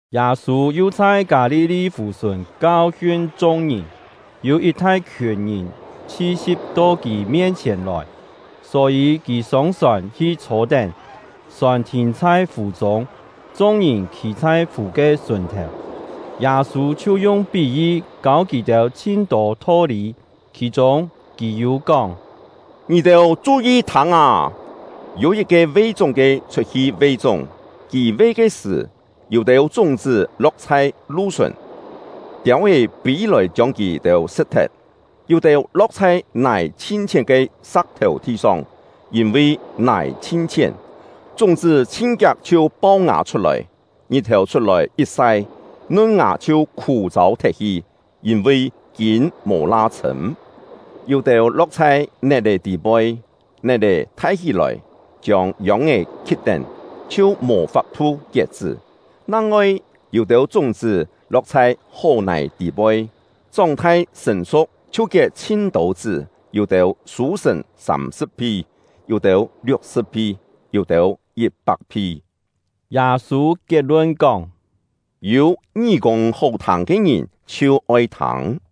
Yâ-sû yu chhai Kâ-li-li fù-sùn kau-hiun chung-ngìn. Yû yit thai-khiùn ngìn chhi-si̍p to kì mien-chhièn lòi, só-yî kì sông sòn hi chhô-tén. Sòn thìn chhai fù-chûng, chung-ngìn khî chhai fù ke sùn-thèu. Yâ-sû chhiu yung pí-yi kâu kì-têu chhin-tô tho-lî; khì-chûng, kì yû kóng: “Ngì-têu chu-yi thâng â! Yû yit-ke ve-chúng-ke chhut-hi ve-chúng. Kì ve ke sṳ̀, yû-têu chúng-chṳ́ lo̍k chhai lu-sùn, tiâu-é pî-lòi chiông kì-têu sṳ̍t-thet. Yû-têu lo̍k chhai nài chhin-chhién ke sa̍k-thèu thi-song; yîn-vi nài chhin-chhién, chúng-chṳ́ chhin-kiak chhiu pau-ngà chhut-lòi; ngit-thèu chhut-lòi yit sai, nun-ngà chhiu khû-châu thet-hi, yîn-vi kîn mò la chhṳ̂m. Yû-têu lo̍k chhai net-è tî-poi, net-è thai hí-lòi, chiông yông-é khi̍t-tén, chhiu mò fap-thu kiet-chṳ́. Nang-ngoi yû-têu chúng-chṳ́ lo̍k chhai hó-nài tî-poi, chóng-thai sṳ̀n-su̍k, chhiu kiet chhin-tô chṳ́, yû-têu sû-sṳ̀n sâm-sṳ̍p-phi, yû-têu liuk-sṳ̍p-phi, yû-têu yit-pak-phi.” Yâ-sû kiet-lun kóng: “Yû ngí-kûng hó-thâng ke ngìn, chhiu oi thâng!”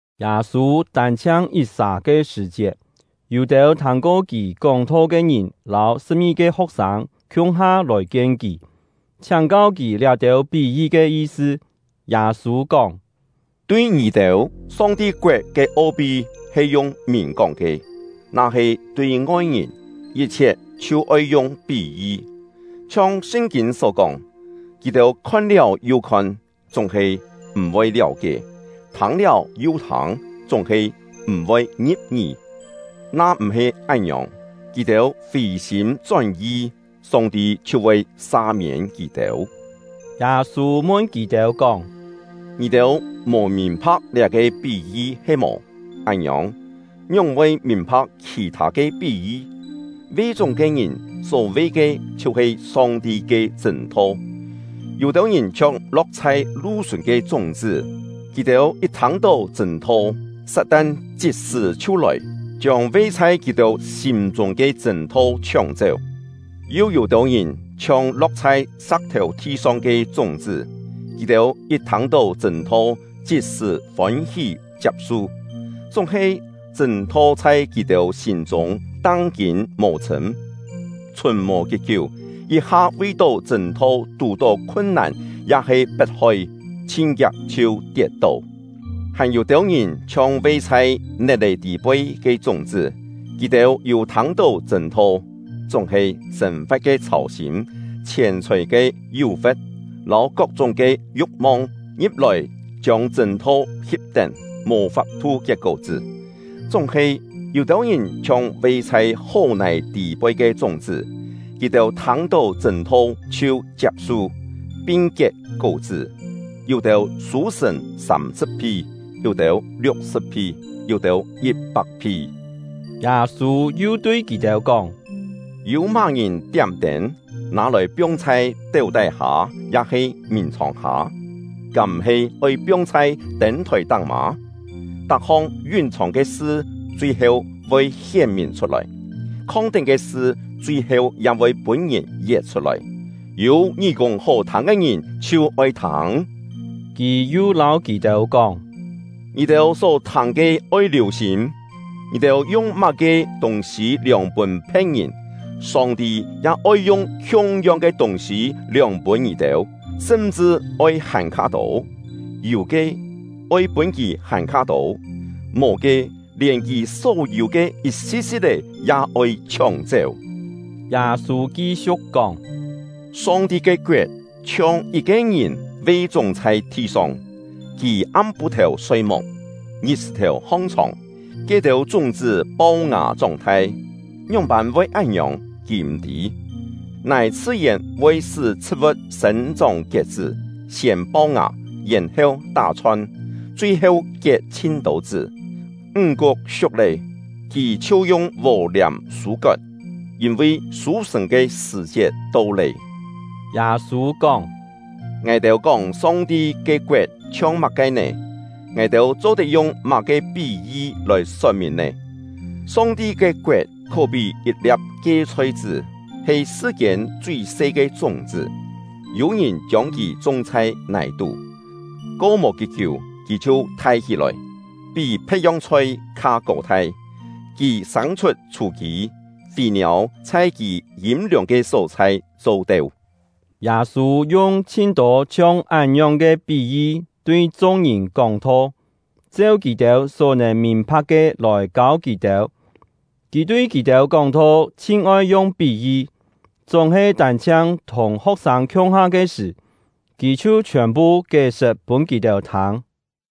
Yâ-sû tân-chhiang yit-sà ke sṳ̀-chiet, yû-têu thâng-ko kì kóng-tho ke ngìn lâu sṳ̍p-ngi-ke ho̍k-sâng khiung-ha lòi-kien kì, chhiáng-kau kì liá-têu pí-yi ke yi-sṳ. Yâ-sû kóng: “Tui ngì-têu, Song-ti koet ke o-pi he yung mìn-kóng ke; na-he tui ngoi-ngìn, yit-chhiet chhiu oi yung pí-yi. Chhiong Sṳn-kîn só kóng: Kì-têu khon-liáu yu khon, chúng-he m̀-voi liáu-kié, thâng-liáu yu thâng, chúng-he m̀-voi ngi̍p-ngí; na-m̀-he án-ngiòng, kì-têu fì-sîm chón-yi, Song-ti chhiu voi sa-miên kì-têu.” Yâ-sû mun kì-têu kóng: “Ngì-têu mò mìn-pha̍k liá-ke pí-yi he-mò? Án-ngiòng, ngióng-voi mìn-pha̍k khì-thâ ke pí-yi? Ve-chúng ke ngìn só ve ke chhiu-he Song-ti ke chṳ̂n-tho. Yû-têu ngìn chhiong lo̍k chhai lu-sùn ke chúng-chṳ́; kì-têu yit thâng-tó chṳ̂n-tho, Sat-tan chit-sṳ̀ chhiu lòi, chiông ve chhai kì-têu sîm-chûng ke chṳ̂n-tho chhióng-chéu. Yu yû-têu ngìn chhiong lo̍k chhai sa̍k-thèu thi-song ke chúng-chṳ́; kì-têu yit thâng-tó chṳ̂n-tho chit-sṳ̀ fôn-hí chiap-su, chúng-he chṳ̂n-tho chhai kì-têu sîm-chûng tang-kîn mò chhṳ̂m, chhùn mò kí-kiú, yit-ha vi-tó chṳ̂n-tho tù-tó khun-nàn ya-he pet-hoi, chhin-kiak chhiu tiet-tó. Hàn yû-têu ngìn chhiong ve chhai net-è tî-poi ke chúng-chṳ́; kì-têu yû thâng-tó chṳ̂n-tho, chúng-he sên-fa̍t ke chhâu-sîm, chhièn-chhòi ke yú-fe̍t, lâu kok-chúng ke yu̍k-mong ngi̍p-lòi chiông chṳ̂n-tho hip-tén, mò fap-thu kiet kó-chṳ́. Chúng-he, yû-têu ngìn chhiong ve chhai hó-nài tî-poi ke chúng-chṳ́; kì-têu thâng-tó chṳ̂n-tho chhiu chiap-su, pin kiet kó-chṳ́, yû-têu sû-sṳ̀n sâm-sṳ̍p-phi, yû-têu liuk-sṳ̍p-phi, yû-têu yit-pak-phi.” Yâ-sû yu tui kì-têu kóng: “Yû má-ngìn tiám-tên, nâ-lòi piong chhai téu tái-hâ ya-he mìn-chhòng-hâ? Kám-m̀-he oi piong chhai tên-thòi-táng mâ? Tak-hong yún-chhòng ke sṳ chui-heu voi hién-mìn chhut-lòi; khong-tén ke sṳ chui-heu ya voi pûn-ngìn yet chhut-lòi. Yû ngí-kûng hó-thâng ke ngìn, chhiu oi thâng!” Kì yu lâu kì-têu kóng: “Ngì-têu só thâng ke oi liù-sîm! Ngì-têu yung má-ke tûng-sî liòng pûn phe̍t-ngìn, Song-ti ya oi yung khiung-yong ke tûng-sî liòng pûn ngì-têu, sṳm-chṳ oi hàn-kha tô. Yû ke, oi pûn kì hàn-kha tô; mò ke, lièn kì só-yû ke yit-si̍t-si̍t-é ya oi chhióng-chéu.” Yâ-sû ki-siu̍k kóng: “Song-ti ke koet chhiong yit-ke ngìn ve-chúng chhai thi-song. Kì am-pû-thèu soi-muk, ngit-sṳ̀-thèu hong-chhòng, ke-têu chúng-chṳ́ pau-ngà chóng-thai, ngióng-pân voi án-ngiòng, kì m̀ tî. Nài chhṳ-yèn voi sṳ́ chhṳ̍t-vu̍t sên-chóng kiet-chṳ́: siên pau-ngà, yèn-heu tá-chhon, chui-heu kiet chhin-tô chṳ́. Ńg-kuk siuk lé, kì chhiu yung vò-liàm sû-kot, yîn-vi sû-sṳ̀n ke sṳ̀-chiet to lé.” Yâ-sû kóng: “Ngài-têu kóng Song-ti ke koet chhiong má-ke nè? Ngài-têu cho-tet yung má-ke pí-yi lòi sot-mìn nè? Song-ti ke koet khó-pí yit-lia̍p kie-chhoi-chṳ́, he sṳ-kiên chui-se ke chúng-chṳ́. Yû-ngìn chiông kì chung chhai nài-tú, ko mò kí-kiú, kì chhiu thai hí-lòi, pí phe̍t-yong chhoi kha kô-thai; kì sâng-chhut chhû-kî, fî-niâu chhai kì yîm-liòng ke só-chhai cho-teu.” Yâ-sû yung chhin-tô chhiong án-ngiòng ke pí-yi tui chung-ngìn kóng-tho, cheu kì-têu só nèn mìn-pha̍k ke lòi kâu kì-têu. Kì tui kì-têu kóng-tho chhin-oi yung pí-yi; chúng-he tân-chhiang thùng ho̍k-sâng khiung-ha ke sṳ̀, kì chhiu chhiòn-phu kié-sṳt pûn kì-têu thâng.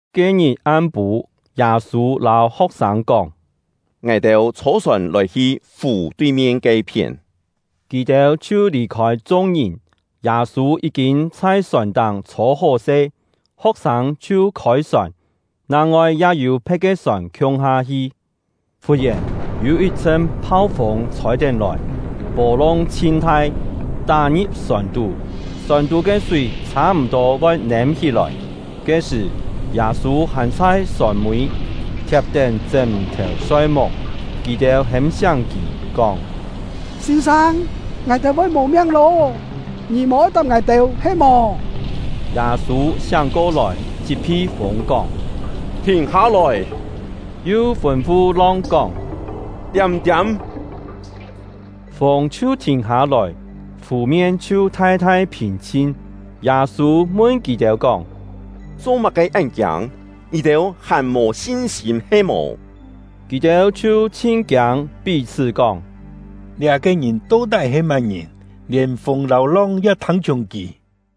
Ke-ngit am-pû, Yâ-sû lâu ho̍k-sâng kóng: “Ngài-têu chhô-sòn lòi-hi fù tui-mien ke-phién.” Kì-têu chhiu lì-khôi chung-ngìn. Yâ-sû yí-kîn chhai sòn-táng chhô-hó-se, ho̍k-sâng chhiu khôi-sòn; nang-ngoi ya yû phe̍t ke sòn khiung-ha hi. Fut-yèn, yû yit-chhṳn phau-fûng chhôi-tén lòi, pô-long chhin thai, tá-ngi̍p sòn-tú, sòn-tú ke súi chhâ-m̀-tô voi nêm-hí-lòi. Ke-sṳ̀, Yâ-sû hàn chhai sòn-mî, thiap-tén chṳ́m-thèu soi-muk. Kì-têu hêm-siáng kì, kóng: “Sîn-sâng, ngài-têu voi mò miang lô, ngì mò-oi tap ngài-têu he-mò?” Yâ-sû siáng ko-lòi, chit-phi fûng kóng: “Thìn hâ-lòi!” Yu fûn-fu long kóng: “Tiâm-tiâm!” Fûng chhiu thìn hâ-lòi, fù-mien chhiu thai-thai phìn-chhin. Yâ-sû mun kì-têu kóng: “Cho-má-ke án kiâng? Ngì-têu hàn mò sin-sîm he-mò?” Kì-têu chhiu chhin kiâng, pí-chhṳ́ kóng: “Liá-ke ngìn to-tái he má-ngìn, lièn fûng lâu long ya thâng-chhiùng kì!”